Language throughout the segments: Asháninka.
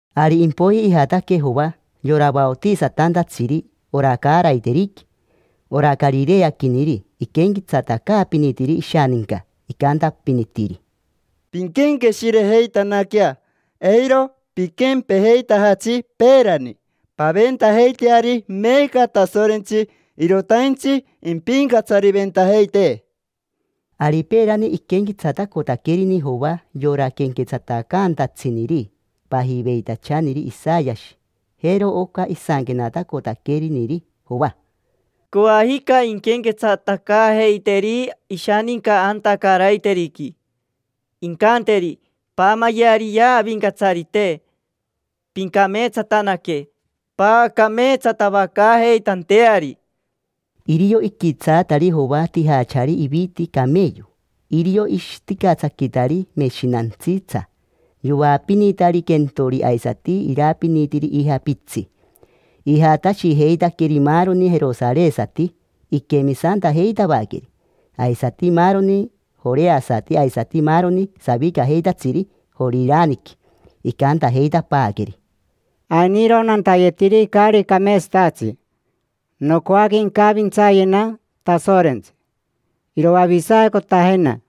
Ari impoiji ijataque Joa, yora vaotisatantatsiri ora caaraiteriqui: ora carireaquiniri. Iquenquetsatacaapinitiri ishaninca, icantapinitiri: —Pinquenqueshirejeitanaquea, eiro piquempejeitajatsi peerani: paventajeiteari meeca Tasorentsi, irotaintsi impincatsariventajeitee. Ari peerani iquenquetsatacotaquerini Joa yora quenquetsatacaantatsiniri pajiveitachaniri Isayashi. Jero oca isanquenatacotaqueriniri Joa: “Coajica inquenquetsatacaajeiteri ishaninca anta caaraiteriqui, incanteri: ‘Paamayeariyea Avincatsarite, pincameetsatanaque paacameetsatavacaajeitanteari’”. Irio iquitsaatari Joa tijachari iviti cameyo. Irio ishiticatsaquitari meshinantsitsa. Yoapinitari quentori aisati irapinitiri ija pitsi. Ijatashijeitaqueri maaroni jerosaresati iquemisantajeitavaqueri, aisati maaroni joreasati aisati maaroni savicajeitatsiri Joriraniqui. Icantajeitapaaqueri: —Ainiro nantayetiri caari cameetsatatsi. Nocoaque incavintsayena Tasorentsi, iroavisacotajena.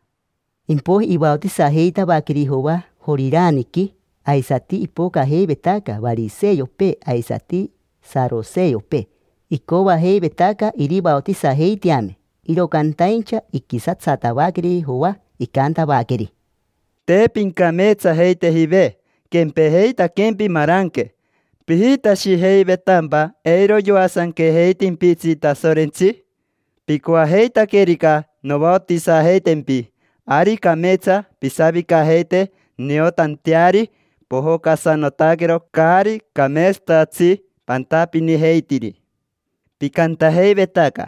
Impoiji ivaotisajeitavaqueri Joa Joriraniqui. Aisati ipocajeivetaca variseopee aisati saroseopee, icoajeivetaca irivaotisajeiteame, iro cantaincha iquisatsatavaqueri Joa. Icantavaqueri: —Te pincameetsajeitejive, quempejeitaquempi maranque. ¿Pijitashijeivetampa eiro yoasanquejeitimpitsi Tasorentsi? Picoajeitaquerica novaotisajeitempi, ari cameetsa pisavicajeite niotanteari pojocasanotaquero caari cameetsatatsi pantapinijeitiri. Picantajeivetaca: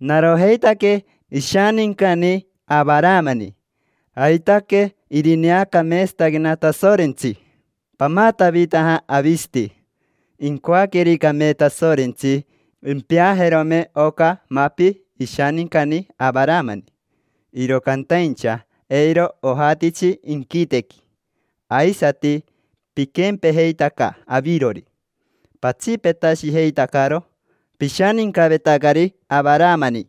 “Narojeitaque ishanincani Avaramani, aitaque irineacameetsataquena Tasorentsi”. Pamatavitaja avisati. Incoaquericame Tasorentsi, impeajerome oca mapi ishanincani Avaramani, iro cantaincha eiro ojatitsi inquitequi. Aisati piquempejeitaca avirori: patsipetashijeitacaro pishanincavetacari Avaramani.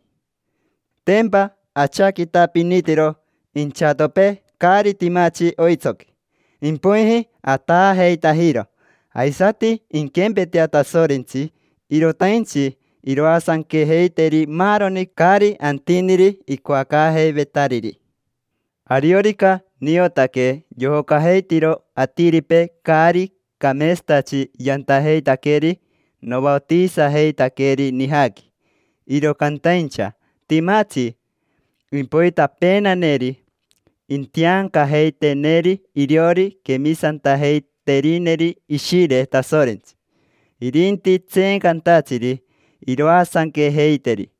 Tempa achaquitapinitiro inchatopee caari timatsi oitsoqui, impoiji ataajeitajiro. Aisati inquempetea Tasorentsi, irotaintsi iroasanquejeiteri maaroni caari antiniri icoacaajeivetariri. Ariorica niotaque yojocajeitiro atiripee caari cameetsatatsi yantajeitaqueri, novaotisajeitaqueri nijaqui. Iro cantaincha timatsi impoitapeenaneri: intiancajeiteneri iriori quemisantajeiterineri Ishire Tasorentsi, irinti tseencantatsiri iroasanquejeiteri.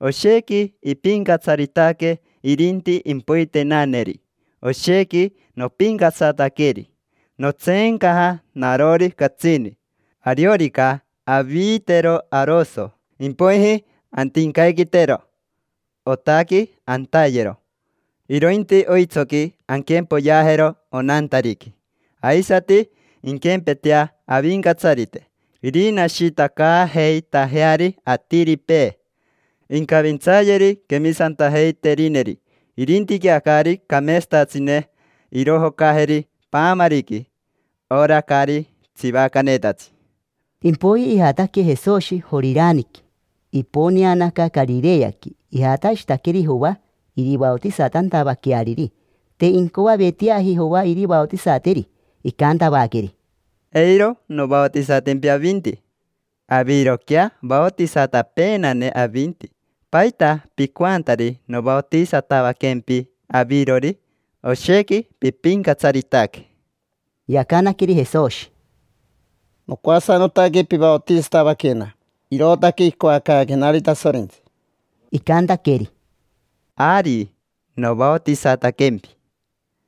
Oshequi ipincatsaritaque irinti impoitenaneri. Oshequi nopincatsataqueri; notseencaja narori catsini. Ariorica aviitero aroso, impoiji antincaiquitero. Otaqui antayero, irointi oitsoqui anquempoyeajero onantariqui. Aisati inquempetea Avincatsarite, irinashitacaajeitajeari atiripee: incavintsayeri quemisantajeiterineri, irintiquea caari cameetsatatsine irojocajeri paamariqui, ora caari tsivacanetatsi. Impoiji ijataque Jesoshi Joriraniqui, iponeanaca Carireaqui. Ijatashitaqueri Joa, irivaotisatantavaqueariri. Te incoaveteaji Joa irivaotisateri, icantavaqueri: —Eiro novaotisatimpitsi avinti. Aviroquea vaotisatapeenane avinti. ¿Paita picoantari novaotisatavaquempi avirori? Oshequi pipincatsaritaque. Yacanaqueri Jesoshi: —Nocoasanotaque pivaotisatavaquena. Irootaque icoacaaquenari Tasorentsi. Icantaqueri: —Ari, novaotisataquempi.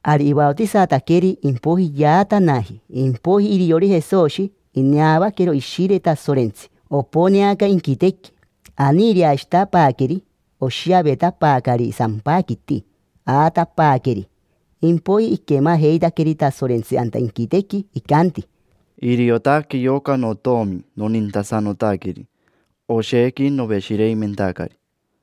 Ari ivaotisataqueri, impoiji yaatanaji. Impoiji iriori Jesoshi, ineavaquero Ishire Tasorentsi, oponeaca inquitequi, aniireashitapaaqueri, oshiavetapaacari sampaquiti. Aatapaaqueri. Impoiji iquemajeitaqueri Tasorentsi anta inquitequi, icanti: —Iriotaque yoca notomi nonintasanotaqueri. Oshequi noveshireimentacari.